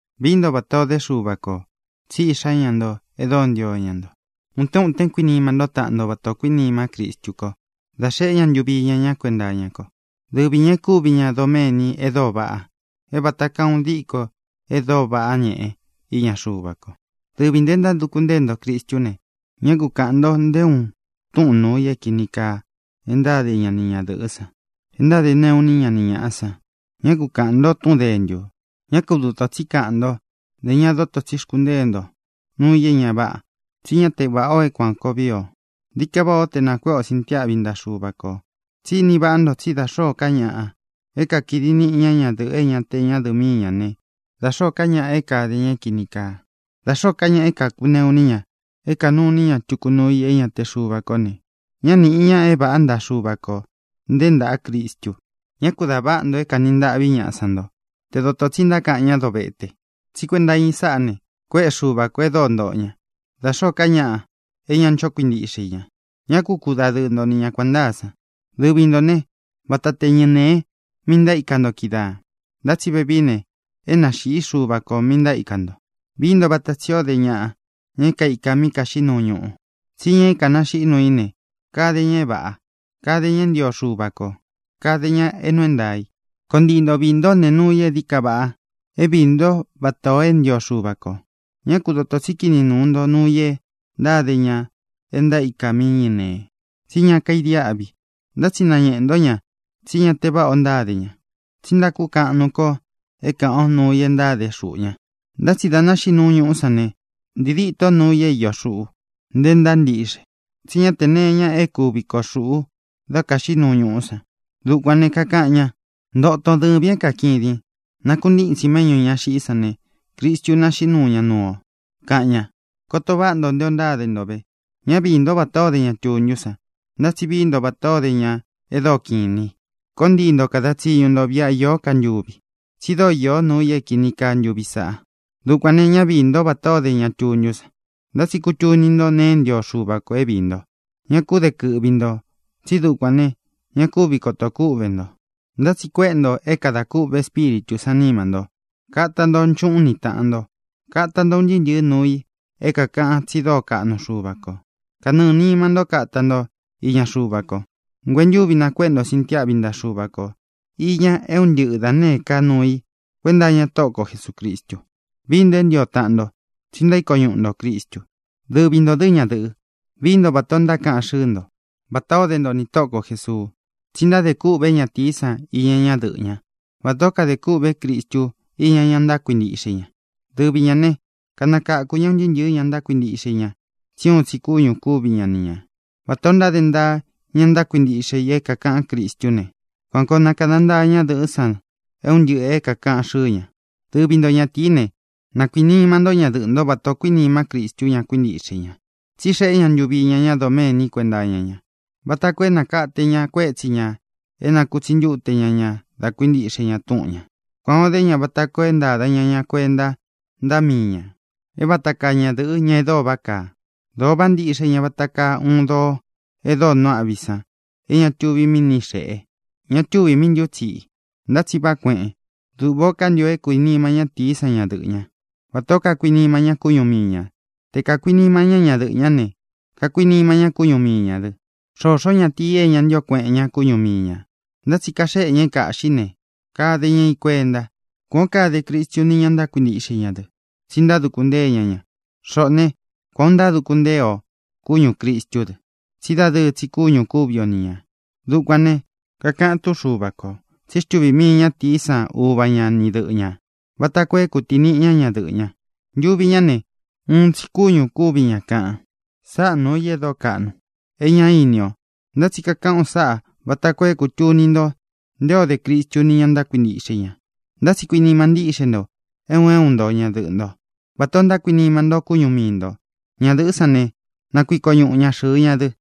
Vií nto vatā ó de Xuva kō, tsí iꞌxá ña nto e dóo ntío ña nto. Utén utén kuinima ntó taꞌan nto vatā o kuínimá Cristu ko dá xeꞌé ña ntuvi iña ña kuenta iña ko. Dɨvi ñā e kúvi ña doméni e dóo vaꞌa, é vata kaa uun diko e dóo váꞌa ñeꞌe iña Xuva ko. Dɨvi ntō e ntáduku ntée nto Cristú ne, ñá ku kāꞌan nto nté uun túꞌūn nuu i é kīni kaa e ntáde ñaꞌa ni ñadɨ̄ꞌɨ́ san, e ntáde neꞌu iní ña ni ñāꞌa san. Ñá ku kāꞌan nto túꞌun dēntu. Ñá ku dotō tsí kaꞌan ntó, ntē ña doto tsí xkuntée nto nuu i é ña váꞌa, tsí ña te váꞌa o é kuān koo víi o. Dií ka váꞌā ó te nākuéꞌe o sintiáꞌvi ntaꞌa Xuva kō. Tsí ini váꞌa nto tsí da xōó ka ñaꞌa é kakidi niꞌi ña ñadɨ̄ꞌɨ é ña te ñádɨ̄ꞌɨ míi ñā né, da xōó ka ñaꞌa é kāde ña é kīni kaa, da xōó ka ñaꞌa é kākuneꞌu iní ña, é kānuu iní ña tuku nuu i é ña te Xuva kó ne, ñá nīꞌi ña é vāꞌá ntaꞌa Xuva kō, nté ntāꞌa Cristu. Ñá ku dā váꞌa nto é kāni ntaꞌví ñaꞌa san nto te dotō tsi ntákaꞌan ñá dovete, tsí kuenta iña i sáꞌā ne, kuéꞌe Xuva kō e dóo ntoꞌo ña, da xōó ka ñaꞌa é ña ncho kuintíꞌxe i ña. Ñá ku kudadɨɨ nto ni ña kuān ntáa san. Dɨvi ntō né, vata te ñɨnēe mi ntaíka nto kídaā, ntá tsi vevií ne, é nāxiꞌí Xuva kō mi ntaíka nto. Vií nto vata tsī ó de ñaꞌa, ña é kaīka mí kaxiꞌí nuu ñuꞌu. Tsí ña é kānaxiꞌí nuu í ne, kade ña é vāꞌa. Kade ña é ntio Xuva kō. Kade ña é nuu é ntaā i. Koo ntii nto viī ntó nee nuu i é dií ka vaꞌa é viī ntó vatā o é ntio Xuva kō. Ñá ku dotō tsí kini nuu nto nuu i e ntáde ña e ntaíka mí ñɨnēe, tsí ña kaidiáꞌvi. Ntá tsi nañeꞌē ntó ña tsí ña te váꞌa o ntáde ña. Tsi ntákukaꞌan nuu ko é kāꞌan o nuu i é ntáde xuꞌu ña. Ntá tsi dā naxiꞌí nuu ñuꞌú san ne, ntii díto nuu i é iō xuꞌú, nte ntáa ntiꞌxe. Tsí ña te nee iña é kuvi koo xuꞌu dá kaxiꞌí nuu ñuꞌú san. Dukuān ne, kakaꞌan ña: Ntoton, dɨvīn é kakidin. Nakuntítsin méꞌñū ña xiꞌí san ne, Cristu naxiꞌí nuu ña nuu o, kaꞌan ña. Koto váꞌa nto nté ō ntáde nto ve. Ñá viī ntó vatā ó de ña tuntú san, ntá tsi vií nto vatā ó de ña e dóo kiꞌin inī i. Koo ntii nto kada tsiñu nto viꞌa īó ka ntuvi, tsi dóo īó nuu i é kīni kaa ntuvi sāꞌa. Dukuān ne, ñá viī ntó vatā ó de ña tuntú san, ntá tsi kutuni nto nee é ntio Xuva kō é viī nto. Ñá ku de kɨꞌvi ntō tsí dukuān ne, ña kúvi kotō kúꞌvē nto. Ntá tsi kuéꞌe nto é kadā kûꞌve Espíritū sán nima nto. Kata nto nchuꞌún ni tāꞌan nto. Kata nto un ntɨɨ́ ntɨ̄ɨ́ nuu i é kākaꞌan tsi dóo kaꞌnu Xuva kō. Kanɨɨ̄ nima ntó kata nto iña Xuva ko. Nguentúvi nakuéꞌe nto sintiáꞌvi ntaꞌa Xuva ko īña é un ntɨꞌɨ da nēé ka nuu i kuenta iña Tóꞌo ko Jesūcristu. Vií nto é ntio taꞌan nto, tsi ntaíko ñuꞌu ntō Cristu. Dɨvi nto, ñadɨ̄ꞌɨ, vií nto vatā ó ntákaꞌan xɨ́ɨ nto, vatā ó de nto nī Tóꞌo ko Jēsuu. Tsi ntádē kûꞌvé ñatīí san iña ñadɨꞌɨ́ ña, vatā ó kade kûꞌvé Cristu iña ña ntákuintiꞌxe i ña. Dɨvi ñā né, kanakakū ñá un ntɨɨ́ ntɨ̄ɨ́ ña ntákuintiꞌxe i ña tsí uun tsi kúñū kúvi ña ni ñā. Vatā o ntáde ntaa ña ntákuintiꞌxe i é kākaꞌán Cristú ne, kuan koo na kāda ntaa ñadɨꞌɨ́ san un ntɨꞌɨ̄ é kākaꞌan xɨ́ɨ ña. Dɨvi nto, ñatīí ne, na kuīnima ntó ñadɨꞌɨ̄ ntó vatā o kuínima Cristu ña kuíntiꞌxe i ña. Tsí xeꞌé ña ntuvi iña ña doméni kuenta iña ña, vata koo é nākate ña kuétsi ñā é nakutsi ntúte ña ña da kuíntiꞌxe ña túꞌun ñā. Kuān o dé ña vata koo é ntāda ña ña kuenta ntaꞌa míi ñā, é vata kaa ñadɨ̄ꞌɨ, ña e dóo váꞌa kaa. Dōo váꞌa ntíꞌxe ña vata kaa uun doo e dóo nuu aꞌví san é ña tuvi míꞌi ni xēꞌe, ña tuvi míꞌi ntútsiꞌi, ntá tsi váꞌa kueꞌen. Duꞌvā ó kantio é kuinima ñatīí san ñadɨꞌɨ̄ ñá, vatā ó kakuinima ña kúñu mii ñā. Te kākuinima ñá ñadɨꞌɨ̄ ñá ne, kakuinima ña kúñu mii ñā dɨ. Xōxó ñatīi é ña ntío kueꞌen ña kúñu mii ñā, ntá tsi kaxéꞌe ña é kāꞌxí ne, kade ña i kuenta. Kuān ó kade Cristu ni ña ntákuintiꞌxe i ña dɨ, tsi ntáduku ntée ña ña. Xoꞌō né, kuān o ntáduku ntée o kúñū Cristú dɨ. Tsí dadɨɨ tsi kúñū kúvi o ni ñā. Dukuān ne, kakaꞌan túꞌun Xuva kō tsí xtuvī mii ñátīí san uva ña ni dɨꞌɨ ñā vata koo é kutīniꞌi ña ñadɨꞌɨ́ ña. Ntuvi ñá ne, uun tsi kúñū kúvi ña, kaꞌan. Sáꞌa nūu i e dóo kaꞌnu, é ña ini o. Ntá tsi kakaꞌán u sáꞌā vata koo é kūtuni nto nté o de Cristu ni ña ntákuintiꞌxe i ña. Ntá tsi kuinima ntíꞌxe nto, é un é un nto, ñadɨꞌɨ̄ ntó vatā o ntákuinima nto kúñu mii ntō. Ñadɨ̄ꞌɨ́ san ne, na kuiko ñuꞌu ña xɨ̄ɨ ña dɨ.